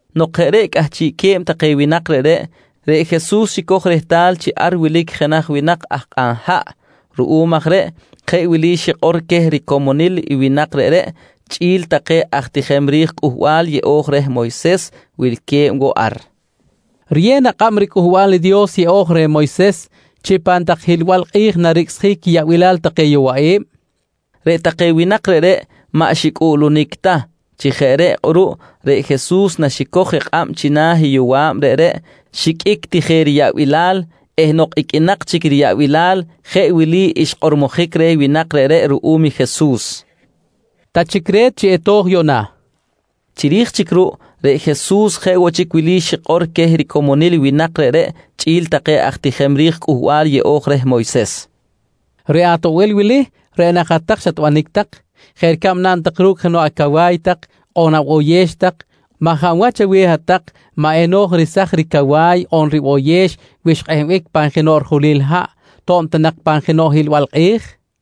Nok jeꞌ reꞌ cꞌahchiꞌque̱b take winak reꞌreꞌ, reꞌ Jesus xicoj rehtal chi ar wilic jenaj winak aj kꞌan haꞌ. Ruꞌum aj reꞌ jeꞌ wili xikꞌor queh ricomonil i winak reꞌreꞌ chꞌi̱l take aj tijem ri̱j Cꞌuhbal Yeꞌo̱j reh Moyses wilque̱b woꞌ ar: «Riyew na kꞌab riCꞌuhbal i Dios Yeꞌo̱j reh Moyses chi pan tak hiꞌlbal kꞌi̱j naricꞌsjic quiyaꞌbilal take yowaꞌi̱b? nqui queh. Reꞌ take winak reꞌreꞌ maꞌ xicꞌuꞌlunic ta. Chi jeꞌ reꞌ kꞌuruꞌ reꞌ Jesus naxicoj i kꞌab china̱ i yowa̱b reꞌreꞌ, xiqꞌuic ti je riyaꞌbilal eh nok iqꞌuinak chic riyaꞌbilal jeꞌ wili xkꞌormojic reh winak reꞌreꞌ ruꞌum i Jesus: «Ta chic re̱t chi eto̱j yuꞌna, nqui reh. Chiri̱j chic ruꞌ reꞌ Jesus jeꞌ woꞌ chic wili xikꞌor queh ricomonil winak reꞌreꞌ chꞌi̱l take aj tijem ri̱j Cꞌuhbal Yeꞌo̱j reh Moyses: «Reꞌ atoꞌbil wili, reꞌ nak hat-tak xatbanic tak jeꞌ ricab naꞌn tak ru̱cꞌ jenoꞌ acawa̱y tak on aboyex tak maj hab wach aweh hat-tak maꞌ eno̱j resaj ricawa̱y on riboyex wi xkꞌehbic jok pan jenoꞌ rijulil haꞌ to̱b ta nak pan jenoꞌ hiꞌlbal kꞌi̱j? nqui Jesus queh.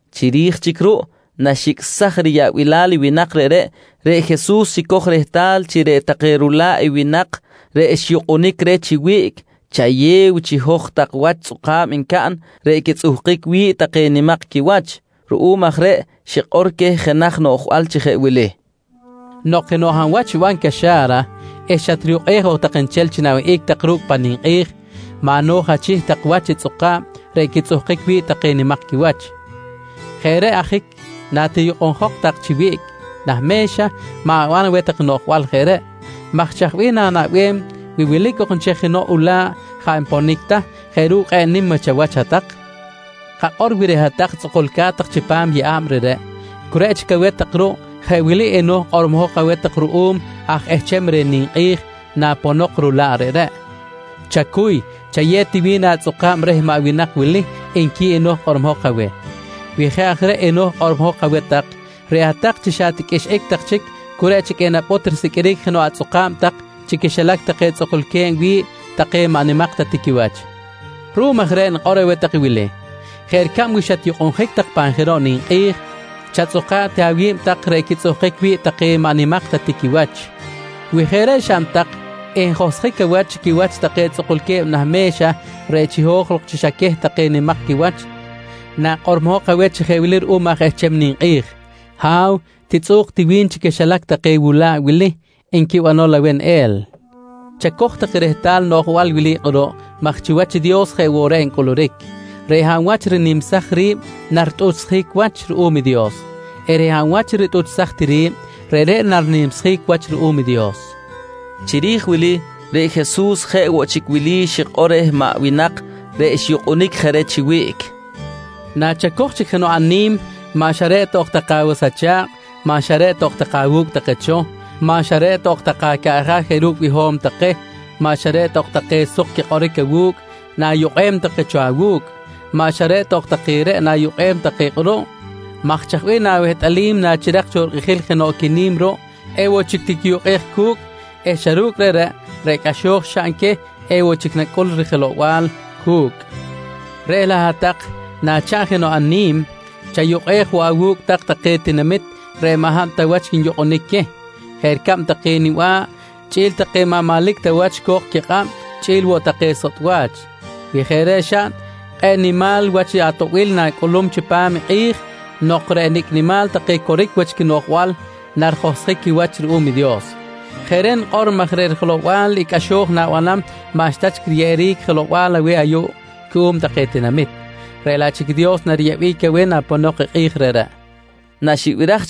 Chiri̱j chic ruꞌ naxicꞌsaj riyaꞌbilal i winak reꞌreꞌ, reꞌ Jesus xicoj je rehtal chi reꞌ take rula̱ꞌ i winak reꞌ xyukꞌunic reh chi wiꞌc chayew chiho̱j tak wach tzꞌuka̱b ncaꞌn reꞌ quitzꞌuhkic wi̱ꞌ take nimak quiwach. Ruꞌum aj reꞌ xikꞌor queh jenaj noꞌjbal chi jeꞌ wili: «Nok jenoꞌ hab wach xiban caxa̱ra eh xatriyukꞌej ok tak nchel chi na̱wihꞌic ru̱cꞌ pan ninkꞌi̱j, maꞌ no̱j achih tak wach i tzꞌuka̱b reꞌ quitzꞌuhkic wi̱ꞌ take nimak quiwach. Jeꞌ reꞌ ajic natiyukꞌunjok tak chi wiꞌc nah me̱xa ma̱ban aweh noꞌjbal jeꞌ reꞌ maj chaj bih na̱naꞌbem wi wilic ok chic cho jenoꞌ ula̱ꞌ jaꞌ nponic ta jeꞌ ru̱cꞌ kꞌe̱ꞌ nim wach chawach hat-tak? Kakꞌor wi reꞌ hat-tak tzꞌukulca̱t tak chipam i yeꞌa̱b reꞌreꞌ, cu reꞌ chic aweh tak ruꞌ jeꞌ wili eno̱j kꞌormojok aweh tak ruꞌum aj ehcham reh ninkꞌi̱j naponok i rula̱ꞌ reꞌreꞌ: ‹Chacuy, chayew ti wi̱n atzꞌuka̱b reh maꞌ winak wili, nqui eno̱j kꞌormojok aweh. «Wi jeꞌ aj reꞌ eno̱j kꞌormojok aweh tak, reꞌ hat-tak chi xa ti qꞌuixꞌic tak chic cu reꞌ chic enapꞌut risiqꞌuiric jenoꞌ atzꞌuka̱b tak chi quixilac take tzꞌukulque̱b wi̱ꞌ take maꞌ nimak ta ti quiwach. Ruꞌum aj reꞌ nikꞌor aweh tak wili: Jeꞌ ricab wi xatyukꞌunjic tak pan jenoꞌ ninkꞌi̱j, chatzꞌuka̱ꞌ ti awi̱b tak reꞌ quitzꞌuhkic wi̱ꞌ take maꞌ nimak ta tiquiwach. Wi jeꞌ reꞌ xaꞌn tak, enjohsjic awach chi quiwach take tzꞌukulque̱b nah me̱xa reꞌ chiho̱j lok chi xa queh take nimak quiwach nakꞌormojok aweh chi jeꞌ wili ruꞌum aj ehcham ninkꞌi̱j: ‹Ha̱w, titzꞌu̱k ti wi̱n chi quixilac take wula̱ꞌ wili, nqui banol aweh neꞌel. «Chacoj tak rehtal i noꞌjbal wili kꞌuruꞌ maj chiwach i Dios jeꞌ woꞌ reꞌ ncꞌuluric. Reꞌ hab wach rinimsaj ri̱b naritꞌuchsjic wach ruꞌum i Dios eh reꞌ hab wach ritꞌuchsaj ti ri̱b, reꞌreꞌ narinimsjic wach ruꞌum i Dios, nqui Jesus. Chiri̱j wili reꞌ Jesus jeꞌ woꞌ chic wili xikꞌor reh maꞌ winak reꞌ xyukꞌunic je reh chi wiꞌc: «Nachacoj chic jenoꞌ ani̱m maꞌ xa reꞌ ta ok take awas acha̱kꞌ, maꞌ xa reꞌ ta ok take awu̱cꞌ take cho, maꞌ xa reꞌ ta ok take acaꞌja̱ jeꞌ ru̱cꞌ biho̱m take, maꞌ xa reꞌ ta ok take suk quikꞌoric awu̱cꞌ na̱yukꞌem take cho awu̱cꞌ. Maꞌ xa reꞌ ta ok take reꞌ nayukꞌej take kꞌuruꞌ maj chaj bih na̱wehtꞌalim nachirak cho rikꞌijil jenoꞌ quini̱m ruꞌ, ewoꞌ chic tiquiyukꞌej cu̱cꞌ eh xa ru̱cꞌ reꞌreꞌ, reꞌ cꞌaxo̱j xaꞌn queh ewoꞌ chic nacꞌul rijelow-bal cu̱cꞌ? Reꞌ laꞌ hat-tak nachaꞌn jenoꞌ ani̱m, chayukꞌej woꞌ je awu̱cꞌ take tinamit reꞌ maꞌ hab ta wach nyukꞌunic queh, jeꞌ ricab take niba̱ꞌ chꞌi̱l take maꞌ manlic ta wach co̱k quikꞌab chꞌi̱l woꞌ take sotꞌ wach. Wi jeꞌ reꞌ xaꞌn, kꞌe̱ꞌ nimal wach atoꞌbil na̱cꞌulum chipam i kꞌi̱j nok reꞌ nicꞌ nimal take coric wach quinoꞌjbal narijohsjic quiwach ruꞌum i Dios. Jeꞌ reꞌ nikꞌor maj reꞌ rijelow-bal i cꞌaxo̱j na̱banam maꞌxta chic riyeꞌeric jelow-bal aweh ayuꞌ cuꞌum take tinamit, reꞌ laꞌ chic i Dios nariyeꞌbic aweh naponok i kꞌi̱j reꞌreꞌ, nqui Jesus reh maꞌ winak reꞌreꞌ.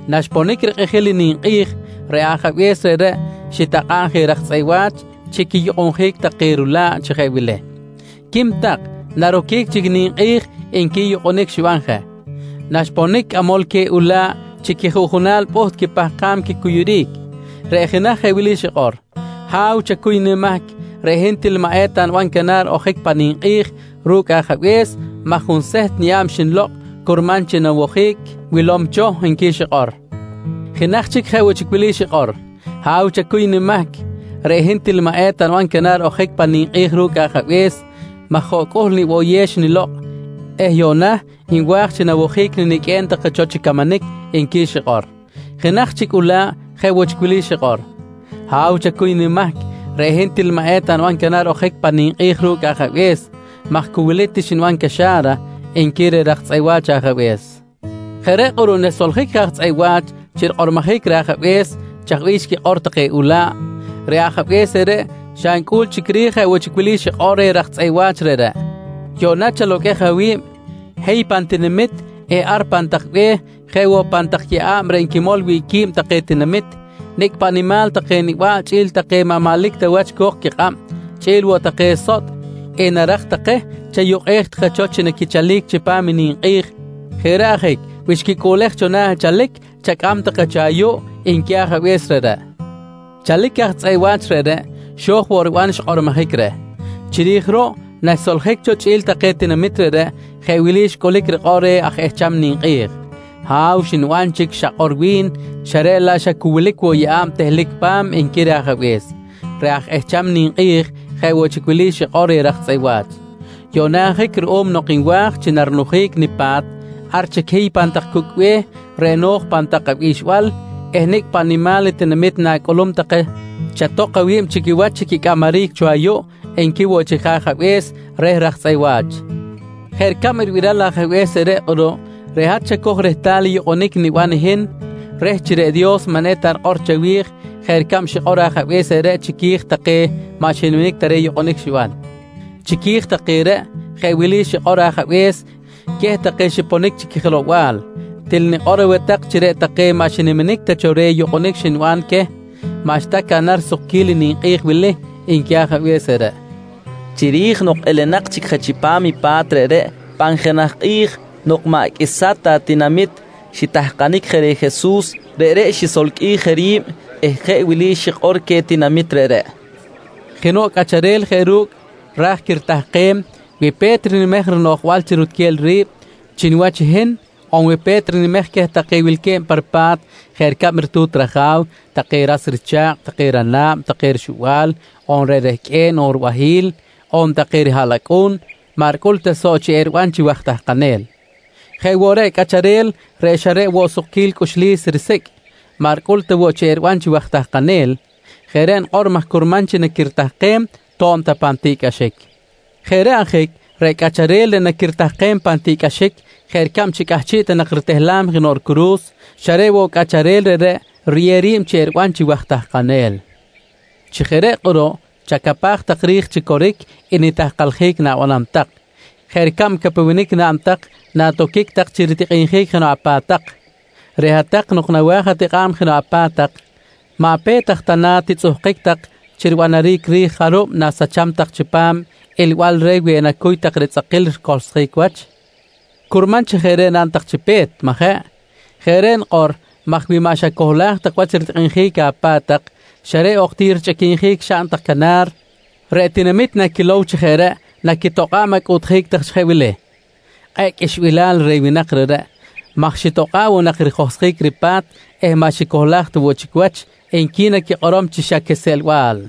Naxponic rikꞌijil i ninkꞌi̱j reꞌ ajabe̱s reꞌreꞌ xitakꞌa̱ꞌ je raj tzꞌeꞌ wa̱ch chi quiyukꞌunjic take rula̱ꞌ chi jeꞌ wili: ‹Quim tak, naroquic chic i ninkꞌi̱j, nqui yukꞌunic xiban je. «Naxponic cꞌamol queh ula̱ꞌ, chi quijuꞌjunal pꞌuht quipahkam quicuyuric. Reꞌ jenaj jeꞌ wili xikꞌor: ‹Ha̱w, chacuy nimahc. Reꞌ hin til maꞌ eta niban canar ojic pan ninkꞌi̱j ru̱cꞌ ajabe̱s maj junseht niyeꞌa̱b xnilokꞌ curman chi nawojic wilom cho, nqui xikꞌor. «Jenaj chic, jeꞌ woꞌ chic wili xikꞌor: ‹Ha̱w, chacuy nimahc. Reꞌ hin til maꞌ eta niban canar ojic pan ninkꞌi̱j ru̱cꞌ ajabe̱s maj hoꞌcꞌuhl niboyex xnilokꞌ eh yuꞌna nwa̱j chi nawojic niniqꞌuem take cho chi camanic, nqui xikꞌor. «Jenaj chic ula̱ꞌ jeꞌ woꞌ wili xikꞌor: ‹Ha̱w, chacuy nimahc. Reꞌ hin til maꞌ eta niban canar ojic pan ninkꞌi̱j ru̱cꞌ ajabe̱s maj cu wili ti xniban caxa̱ra, nqui reh raj tzꞌeꞌ wa̱ch ajabe̱s. «Jeꞌ reꞌ kꞌuruꞌ naxsoljic je aj tzꞌeꞌ wa̱ch chi rikꞌormojic reh ajabe̱s chaj bih xquikꞌor take ula̱ꞌ, reꞌ ajabe̱s reꞌreꞌ xa ncꞌul chic ri̱j jeꞌ woꞌ chic wili xikꞌor reh raj tzꞌeꞌ wa̱ch reꞌreꞌ: ‹Yuꞌna chaloqꞌuej awi̱b. Hiy pan tinamit eh ar pan tak be̱h jeꞌ woꞌ pan tak yeꞌa̱b reꞌ nquimol wi̱ꞌ qui̱b take tinamit. Nicꞌ paꞌ nimal take niba̱ꞌ chꞌi̱l take maꞌ manlic ta wach co̱k quikꞌab, chꞌi̱l woꞌ take sotꞌ enarak take chayukꞌej take cho chi naquichalic chipam i ninkꞌi̱j. Jeꞌ reꞌ ajic wi xquicꞌuꞌlej cho na̱ chalic, chacꞌam take cho ayuꞌ, nqui ajabe̱s reꞌreꞌ. «Chalic i aj tzꞌeꞌ wa̱ch reꞌreꞌ xo̱j woꞌ riban i xkꞌormojic reh. Chiri̱j ruꞌ, naxsoljic cho chꞌi̱l take tinamit reꞌreꞌ jeꞌ wili xcꞌulic rikꞌor reh aj ehcham ni̱m: ‹Ha̱w, xniban chic i xakꞌor wi̱n xa reꞌ laꞌ xa cu wilic woꞌ yeꞌa̱b tehlic pa̱m, nqui reh ajabe̱s. «Reꞌ aj ehcham ni̱m jeꞌ woꞌ chic wili xikꞌor reh raj tzꞌeꞌ wa̱ch: ‹Yuꞌna ajic ruꞌum nok nwa̱j chi narinujic nipa̱t, ar chic hiy pan tak cucꞌ be̱h reꞌ no̱j pan tak abixbal eh nicꞌ paꞌ nimal tinamit na̱cꞌulum take chatok awi̱b chi quiwach chi quicꞌamaric cho ayuꞌ, nqui woꞌ chic je ajabe̱s reh raj tzꞌeꞌ wa̱ch. «Jeꞌ ricab ribiral i ajabe̱s reꞌreꞌ kꞌuruꞌ, reꞌ hat chacoj rehtal i yukꞌunic niban i hin reh chi reꞌ Dios maꞌ eta rikꞌor chawi̱j jeꞌ ricab xikꞌor ajabe̱s reꞌreꞌ chiqui̱j take maꞌ xiniminic ta reh yukꞌunic xiban. Chiqui̱j take reꞌ, jeꞌ wili xikꞌor i ajabe̱s queh take xiponic chi quijelow-bal: ‹Til nikꞌor aweh tak chi reꞌ take maꞌ xiniminic ta cho reh yukꞌunic xniban queh maꞌxta caꞌnam risukquil i ninkꞌi̱j wili, nqui ajabe̱s reꞌreꞌ, nqui Jesus reh winak reꞌreꞌ. Chiri̱j nok elenak chic je chipam i pa̱t reꞌreꞌ, pan jenaj kꞌi̱j nok maꞌ qꞌuisa ta tinamit xitahkanic je reh Jesus, reꞌreꞌ xisolqꞌuij je ri̱b eh jeꞌ wili xikꞌor queh tinamit reꞌreꞌ: «Jenoꞌ cꞌacharel jeꞌ ru̱cꞌ ra̱j quiritahkem, wi pe̱t rinimej rinoꞌjbal chi rutquel ri̱b chi niwach i hin on wi pe̱t rinimej queh take wilque̱b pa ripa̱t jeꞌ ricab ritu̱t raja̱w, take ras richa̱kꞌ, take rana̱b, take rixuba̱l on reꞌ rehqꞌue̱n on ribahi̱l on take rihaꞌlacꞌu̱n, maꞌ ricꞌul ta soꞌ chi eriban chi waj tahkanel. Jeꞌ woꞌ reꞌ i cꞌacharel reꞌ xa reꞌ woꞌ sukquil cꞌuxlis risicꞌ, maꞌ ricꞌul ta woꞌ chi eriban chi waj tahkanel, Jeꞌ reꞌ nikꞌor maj curman chi naquiritahkem to̱b ta pan tiꞌcꞌaxic. Jeꞌ reꞌ ajic reꞌ cꞌacharel reꞌ naquiritahkem pan tiꞌcꞌaxic jeꞌ ricab chi cꞌahchiꞌ ta nak ritehlam jenoꞌ ricuru̱s, xa reꞌ woꞌ cꞌacharel reꞌreꞌ riyew ri̱b chi eriban chi waj tahkanel. Chi jeꞌ reꞌ kꞌuruꞌ chacapaj tak ri̱j chi coric i nitahkaljic na̱banam tak jeꞌ ricab i capewenic naꞌn tak natoquic tak chi ritikꞌinjic jenoꞌ apa̱t tak. Reꞌ hat-tak nok nawa̱j atikꞌa̱b jenoꞌ apa̱t tak, maꞌ pe̱t aj ta na titzꞌuhkic tak chi ribanaric ri̱j jarub na̱sacham tak chipam ilbal reh wi enacuy tak ritzꞌakil ricohlsjic wach? Curman chi jeꞌ reꞌ naꞌn tak chi pe̱t, majeꞌ? Jeꞌ reꞌ nikꞌor maj wi maꞌ xacohlaj wach ritikꞌinjic apa̱t tak xa reꞌ ok ti richꞌiquinjic xaꞌn tak canar, reꞌ tinamit naquilow chi jeꞌ reꞌ naquitokꞌa̱b acꞌuꞌtjic tak chi jeꞌ wili: ‹Kꞌe̱ꞌ qꞌuixbilal reh winak reꞌreꞌ maj xitokꞌa̱ꞌ woꞌ nak rijohsjic ripa̱t eh maꞌ xicohlaj ta woꞌ chic wach, nqui naquikꞌorom chi xa quiseꞌlbal.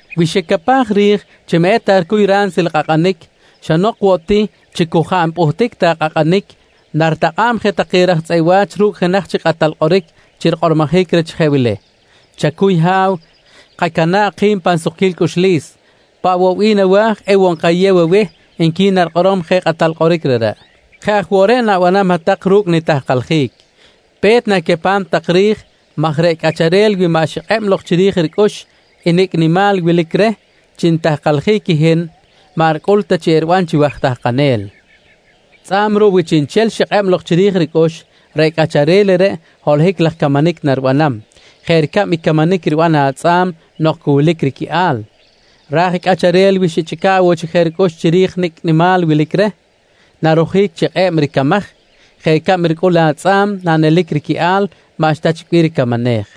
Wi xicapaj ri̱j chi maꞌ eta ricuy ransil kꞌakꞌanic, xa nok woꞌ ti chi cu jaꞌ npꞌuhtic ta kꞌakꞌanic naritakꞌa̱b je take raj tzꞌeꞌ wa̱ch ru̱cꞌ jenaj chic kꞌatal kꞌoric chi rikꞌormojic reh chi jeꞌ wili: ‹Chacuy Ha̱w, kacana̱ꞌ ki̱b pan sukquil cꞌuxlis. Paꞌ woꞌ bih nawa̱j ewoꞌ nkayew aweh, nqui narikꞌorom je i kꞌatal kꞌoric reꞌreꞌ. «Jeꞌ aj woꞌ reꞌ na̱banam hat-tak ru̱cꞌ nitahkaljic. Pe̱t, na̱capam tak ri̱j maj reꞌ cꞌacharel wi maꞌ xikꞌeb lok chiri̱j ricꞌux i nicꞌ nimal wilic reh chi nitahkaljic i hin maꞌ ricꞌul ta chi eriban chi waj tahkanel. Tzꞌa̱b ruꞌ, wi chiꞌnchel xikꞌeb lok chiri̱j ricꞌux, reꞌ cꞌacharel reꞌreꞌ holohic laj camanic naribanam jeꞌ ricab i camanic riban i atzꞌa̱m nok cu wilic riquiꞌal. Raj i cꞌacharel wi xichꞌica̱ꞌ woꞌ chic je ricꞌux chiri̱j nicꞌ nimal wilic reh, narojic chi kꞌe̱b i ricamaj jeꞌ ricab ricꞌul atzꞌa̱m nanelic riquiꞌal maꞌxta chic bih ricamanej.